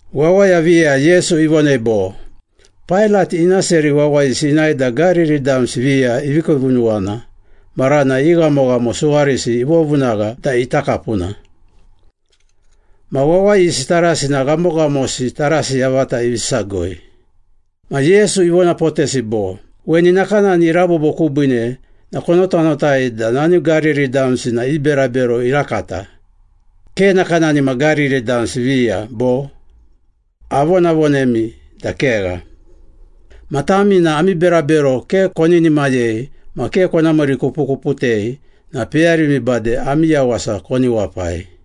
Wawaya viya Yesu ivonei bo, “Pailat ina seri wawayisi inae da Gariri damsi viya ivi kiivunuwana maranai i ghamoghamo suwarisi ivovovunagha da ita kapuna. Ma wawayisi tarasi na ghamoghamosi tarasi yavata ivi sagoi.” Ma Yesu ivonapotesi bo, “Weni nakanani irabobo kubiine na konotanotai da nani Gariri damsi na i berabero irakata, ke nakanani ma Gariri damsi viya, bo? Avonavonemi da kegha! Ma tami na ami berabero ke koninimayei ma ke kona miirikupukuputei na peyarimi bade ami yawasa koni wapai.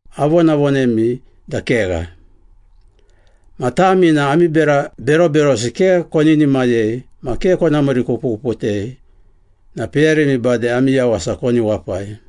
Avonavonemi da kegha! Ma tami na ami bera beroberosi ke koninimayei ma ke kona miirikupukuputei na peyarimi bade ami yawasa koni wapai.”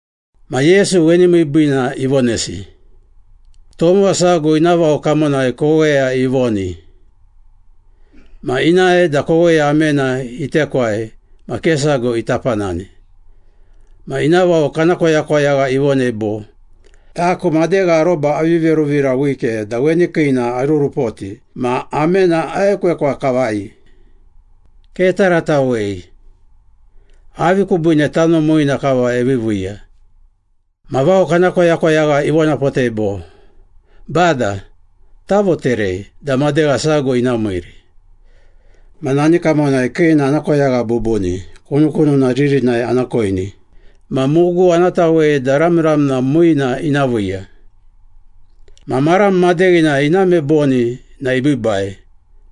Ma Yesu weni miibiina ivonesi. “Tomowa sago ina vao kamonai koweya ivoni. Ma inae da koweya amena itekwai ma ke sago ita panani. Ma ina vao kana koyakoyagha ivonei bo, ‘Taku madegha aroba avi veruvira wike da weni kiina arurupoti ma amena aekwekwa kavai. Ketaratawei! Avi kubiine tano muina kava eviviiya?’ Ma vao kana koyakoyagha ivonapotei bo, ‘Bada, tavoterei da madegha sago ina miiri. Ma nani kamonai kiina ana koyagha bubuni, kunukununa ririnai ana koini ma mugu ana tawei da ramramna muina ina viiya. Ma maram madeghinai iname boni na ibiibai.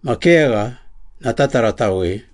Ma kegha, na tataratawei.’”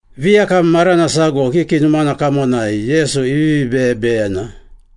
Viyakam marana sago kiki numana kamonai Yesu ivivi beyebeyena.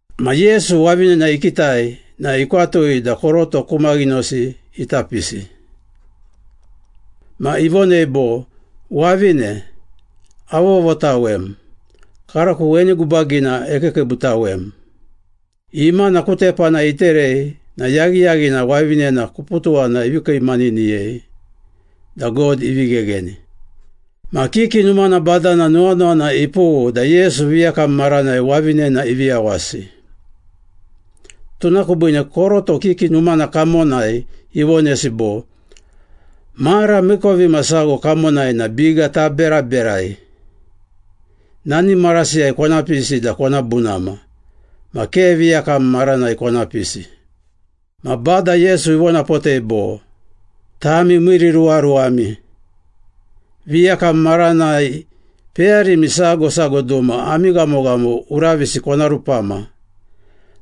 Ma Yesu wavinena ikitai na ikwatui da koroto ku maghinosi ita pisi. Ma ivonei bo, “Wavine, avovotawem, karako weni gubagina ekiikiibutawem.” Imana ku tepana iterei na yaghiyaghina wavinena kuputuwana ivi kiimaniniyei da God ivi ghegheni. Ma kiki numana badana nuwanuwana ipughu da Yesu viyakam maranai wavinena ivi yawasi. Tuna kubiine koroto kiki numana kamonai ivonesi bo, “Mara miikovimasago kamonai na biga taberaberai. Nani marasiyai kona pisi da kona bunama. Ma ke viyakam maranai kona pisi.” Ma Bada Yesu ivonapotei bo, “Tami miiriruwaruwami! Viyakam maranai peyarimi sago sago duma ami ghamoghamo uravisi kona rupama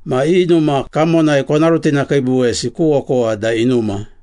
ma i numa kamonai kona rutinakiibuwesi ku okowa da inuma.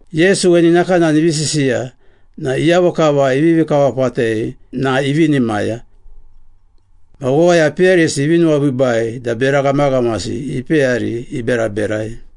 Yesu weni nakanani ivi sisiya na iyavo kava ivivi kawapatei na ivinimaya. Ma wawaya peyarisi ivi nuwabiibai da bera ghamaghamasi ipeyari iberaberai.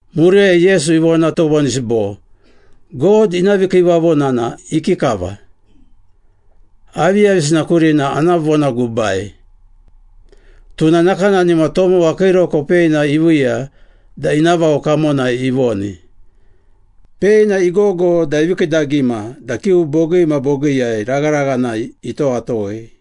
Muriyai Yesu ivona tovonisi bo, “God ina vikiivavona na ikikava? Aviyavisina kurina ana vonagubai? Tuna nakanani ma tomowa kiiroko peina iviiya da ina vao kamonai ivoni. Peina igogo da ivi kiidagima da kiu bogii ma bogiiyai ragharaghanai itowatowei.”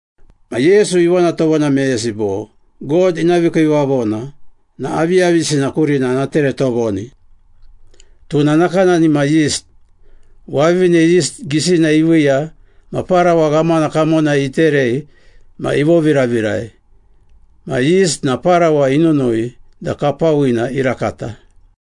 Ma Yesu ivona tovona meyesi bo, “God ina vikiivavona na aviyavisina kurina ana tere tovoni? Tuna na nakanani ma yist. Wavine yist gisina iviiya ma parawa ghamana kamonai iterei ma ivoviravirai. Ma yist na parawa inunui da kapawina irakata.”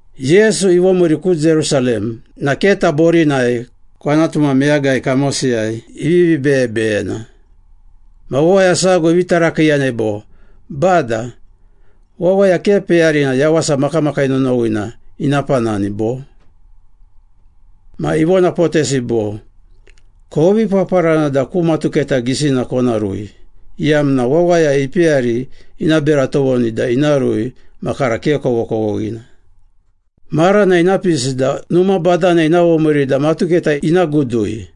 Yesu ivomiiri ku Jerusalem na keta borinai kwanatu ma meyagai kamosiyai ivivi beyebeyena. Ma wawaya sago ivi tarakiiyanei bo, “Bada, wawaya ke peyarina yawasa makamakii nonowina ina panani, bo?” Ma ivonapotesi bo, “Kovi paparana da ku matuketa gisina kona rui, iyamna wawaya ipeyari ina bera tovoni da ina rui ma kara ke kovokovoghina. Marana ina pisi da numa badana ina vomiiri da matuketa ina gudui.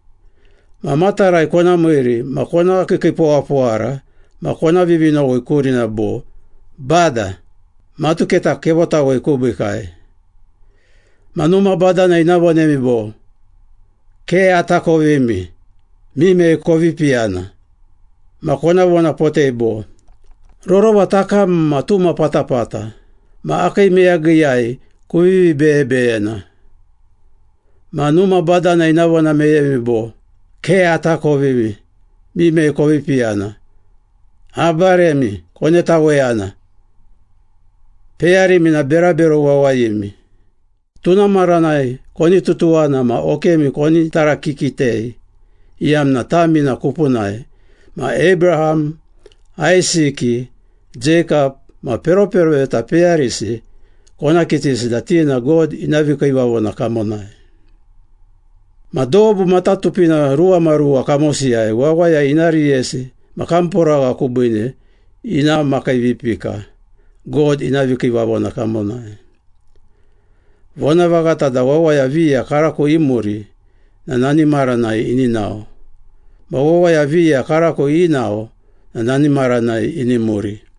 Ma matarai kona miiri ma kona kiikiipowapowara ma kona vivinowi kurina bo, ‘Bada, matuketa kevotawei kubiikai.’ Ma numa badana ina vonemi bo, ‘Ke atakovimi! Mimei kovi piyana?’ Ma kona vonapotei bo, ‘Rorova takam ma tuma patapata ma akii meyagiyai kuvivi beyebeyena.’ Ma numa badana ina vona meyemi bo, ‘Ke atakovimi. Mimei kovi piyana? Abaremi, konetaweyana. Peyarimi na berabero wawayimi!’ Tuna maranai koni tutuwana ma okemi koni tarakikitei iyamna tami na kupunai, ma Abraham, Aisiki, Jeikap ma peroperoveta peyarisi kona kitisi da ti na God ina vikiivavona kamonai. Ma dobu matatupina ruwamaruwa kamosiyai wawaya ina riyesi ma kamporagha kubiine ina makiivipika God ina vikiivavona kamonai. Vonavaghata da wawaya viya karako imuri na nani maranai ini nao, ma wawaya viya karako inao na nani maranai ini muri.”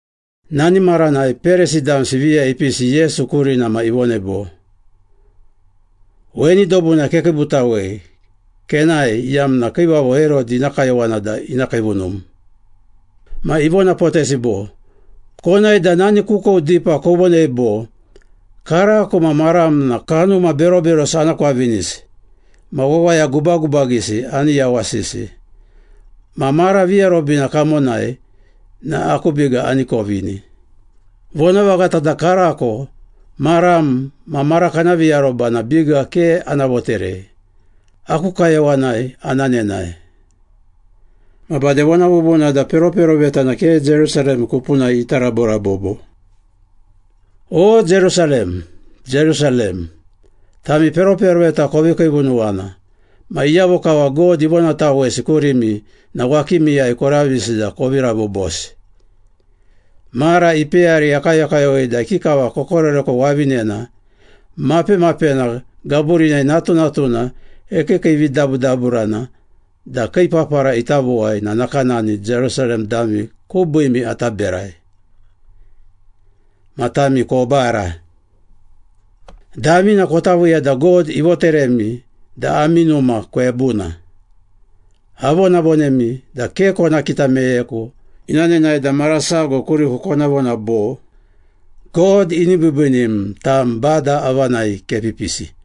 Nani maranai Perisi damsi viya ipisi Yesu kurina ma ivonei bo, “Weni dobuna kekiibutawei kenae iyamna Kiivavo Herodi ina kayowana da ina kiivunum.” Ma ivonapotesi bo, “Konae da nani kukou dipa kovonei bo, ‘Karako ma maram na kanuma beroberosi ana kwavinisi ma wawaya gubagubagisi ani yawasisi, ma mara viarobina kamonai na aku biga ani kovini.’ Vonavaghata da karako, maram ma mara kana viaroba na biga ke ana voterei, aku kayowanai ana nenae. Ma bade vona bubuna da peroperoveta na ke Jerusalem kupunai ita raborabobo.” “O, Jerusalem, Jerusalem! Tami peroperoveta kovi kiivunuwana. Ma iyavo kava God ivonatawesi kurimi na wakimiyai koravisi da kovi rabobosi. Mara ipeyari akayokayowei da ikikava kokoreko wavinena mapemapena gaburinai natunatuna ekiikiividabudaburana da kii papara ita vowai na nakanani Jerusalem dami kubiimi ata berai. Ma tami kobara. Damina kota viiya da God ivoteremi da ami numa kwebuna. Avonavonemi da ke kona kita meyeku ina nenae da mara sago kuriku kona vona bo, ‘God ini biibiinim, tam Bada avanai kepipisi!’”